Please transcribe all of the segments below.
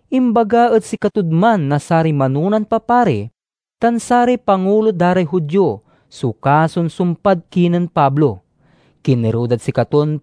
Imbaga ed sikatod man na saray manonan papari tan saray pangulo da ray Judio so kason sumpad kinen Pablo. Kinerew dad sikaton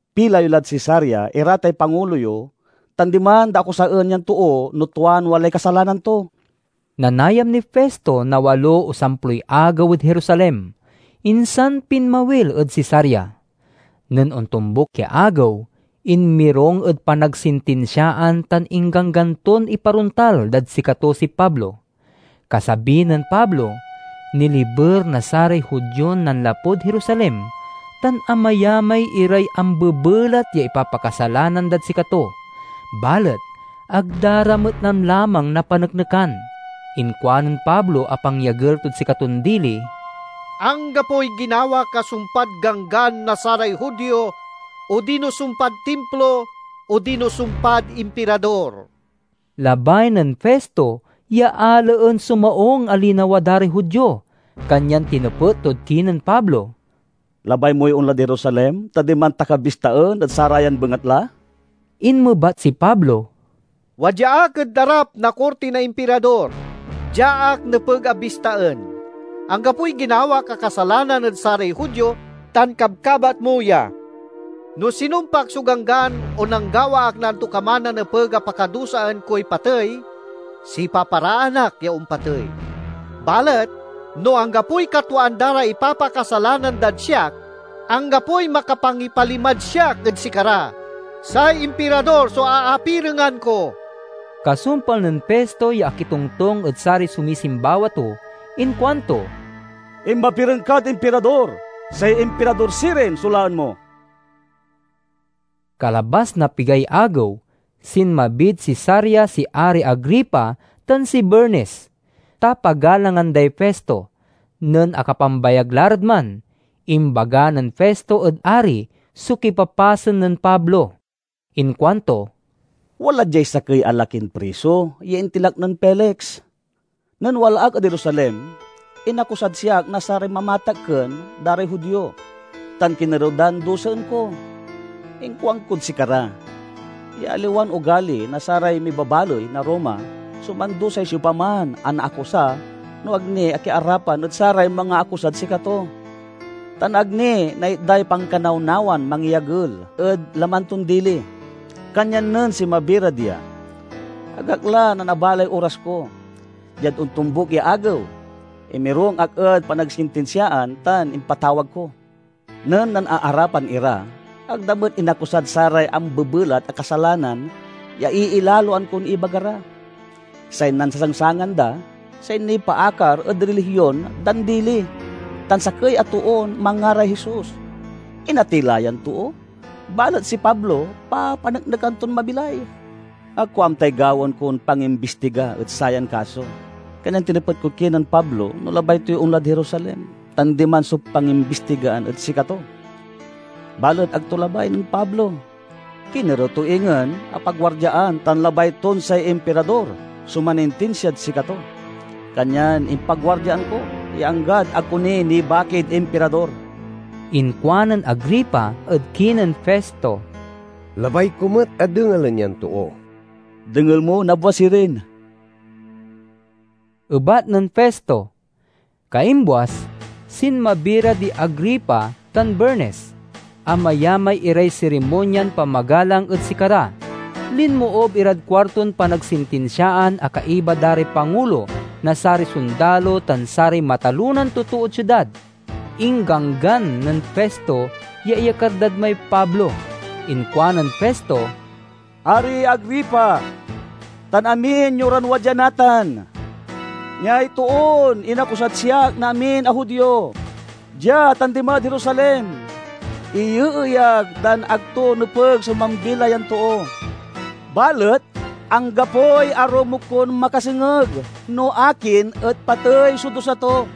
Pila yo lad Cesarea ira tay pangulo yo tan diman da akusaen yan too no tuan walay kasalanan to." Nanayam niy Festo na walo o samploy agew ed Jerusalem, insan pinmawil ed Cesarea. Nen ontombuk ya agew, inmirung ed panagsintinsiaan tan ingganggan ton iparontal dad sikato si Pablo. Kasabi nen Pablo, niliber na saray Judion nanlapud Jerusalem tan amayamay iray ambebelat ya ipapakasalanan dad sikato, balet ag da ra met lamlamang napaneknekan. Inkuanen Pablo a pangyagel tod sikaton dili, "Anggapoy ginawak a sumpad Ganggan na saray Judio, odino sumpad Timplo odino sumpad Impirador." Labay nen Festo ya alaen so maung a linawa da ray Judio, kanyan tinepet tod kinen Pablo, "Labay moy onlad Jerusalem, ta diman ta ka bistaen ed sarayan bengatla?" Inmebat si Pablo, "Wadya ak ed arap na korti na Impirador. Dia ak nepeg a bistaen. Anggapoy ginawak a kasalanan ed saray Judio tan kabkabat mo ya. No sinumpak so ganggan o nanggawa ak na antokaman a nepeg a pakadusaan koy patey, sipaparaan ak ya ompatey. Balet no anggapoy katwaan da ray ipapakasalanan dad siak, anggapoy makapangipalimad siak ed sikara. Say Impirador so aapirengan ko." Kasumpal nen Festo ya akitongtong ed saray sumisimbawa to inkuanto, "Inmapireng kad Impirador, say Impirador sirin so laen mo." Kalabas na pigay agew, sinmabid Cesarea si Ari Agripa tan si Bernice, ta pagalangan day Festo. Nen akapambayag la rad man, imbaga nen Festo ed ari so kipapasen nen Pablo. Inkuanto, "Wala diay sakey a lakin priso ya intilak nen Felix. Nen wala ak ed Jerusalem, inakusad siak na saray mamatakken da ray Judio, tan kinerew dan dusaen ko. Inkuankod sikara ya aliwan ogali na saray mibabaley na Roma so mandusay siopaman a naakusa no ag ni akiarapan ed saray mangaakusad sikato, tan ag ni naitday pankanawnawan mangyagel ed laman ton dili. Kanyan nen sinmabi ra dia ag ak la nanabalay oras ko. Diad ontombuk ya agew, inmirung ak ed panagsintinsiaan tan impatawag ko. Nen nanaarapan ira, ag da met inakusad saray ambebelat a kasalanan ya iilaloan kon ibaga ra. Say nansasangsangan da say nipaakar ed rilihion dan dili tan sakey a toon manngaray Jesus. Inatey la yan too, balet si Pablo papaneknekan ton mabilay. Ag ko amtay gawaen kon pangimbistiga ed sayan kaso, kanyan tinepet kod kinen Pablo no labay toy onlad Jerusalem tan diman so pangimbistigaan ed sikato. Balet ag to labay nen Pablo. Kinerew to ingen a paguardiaan tan labay ton say Impirador so manintinsiad sikato. Kanyan impaguardiaan ko ya anggad ag ko ni nibakid Impirador." Inkuanen Agripa ed kinen Festo, "Labay ko met a dengelen yan too." "Dengel mo nabwas sirin," ebat nen Festo. Kaimbuas, sinmabi ra di Agripa tan Bernice; amayamay iray sirimonyan pamagalang ed sikara. Linmoob irad kuarton panagsintinsiaan a kaiba da ray pangulo na saray sondalo tan saray matalonan totood siudad. Ingganggan nen Festo ya iyakar dad may Pablo. Inkuanen Festo, "Ari Agripa, tan amin yo ran wadya natan: Niay toon inakusad siak na amin a Judio, dia tan dimad Jerusalem. Iyeeyag dan ag to nepeg so mambilay yan too. Balet anggapoy arumog kon makasengeg no akin et patey so dusa to.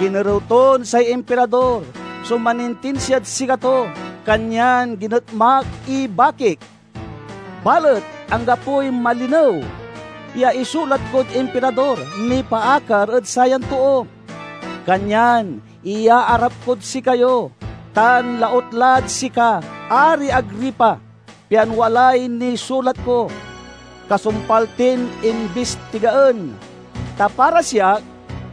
Kinerew ton say Impirador so manintinsiad sikato, kanyan ginetmak ibakik. Balet anggapoy malinew ya isulat kod Impirador nipaakar ed sayan too. Kanyan iyaarap kod sikayo tan lautlad sika, Ari Agripa, pian walay nisulat ko, kasumpal tin imbistigaen. Ta para siak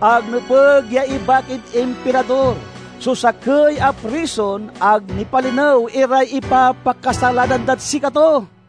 ag nepeg ya ibakid Impirador so sakey a prison ag nipalinew iray ipapakasalanan dad sikato."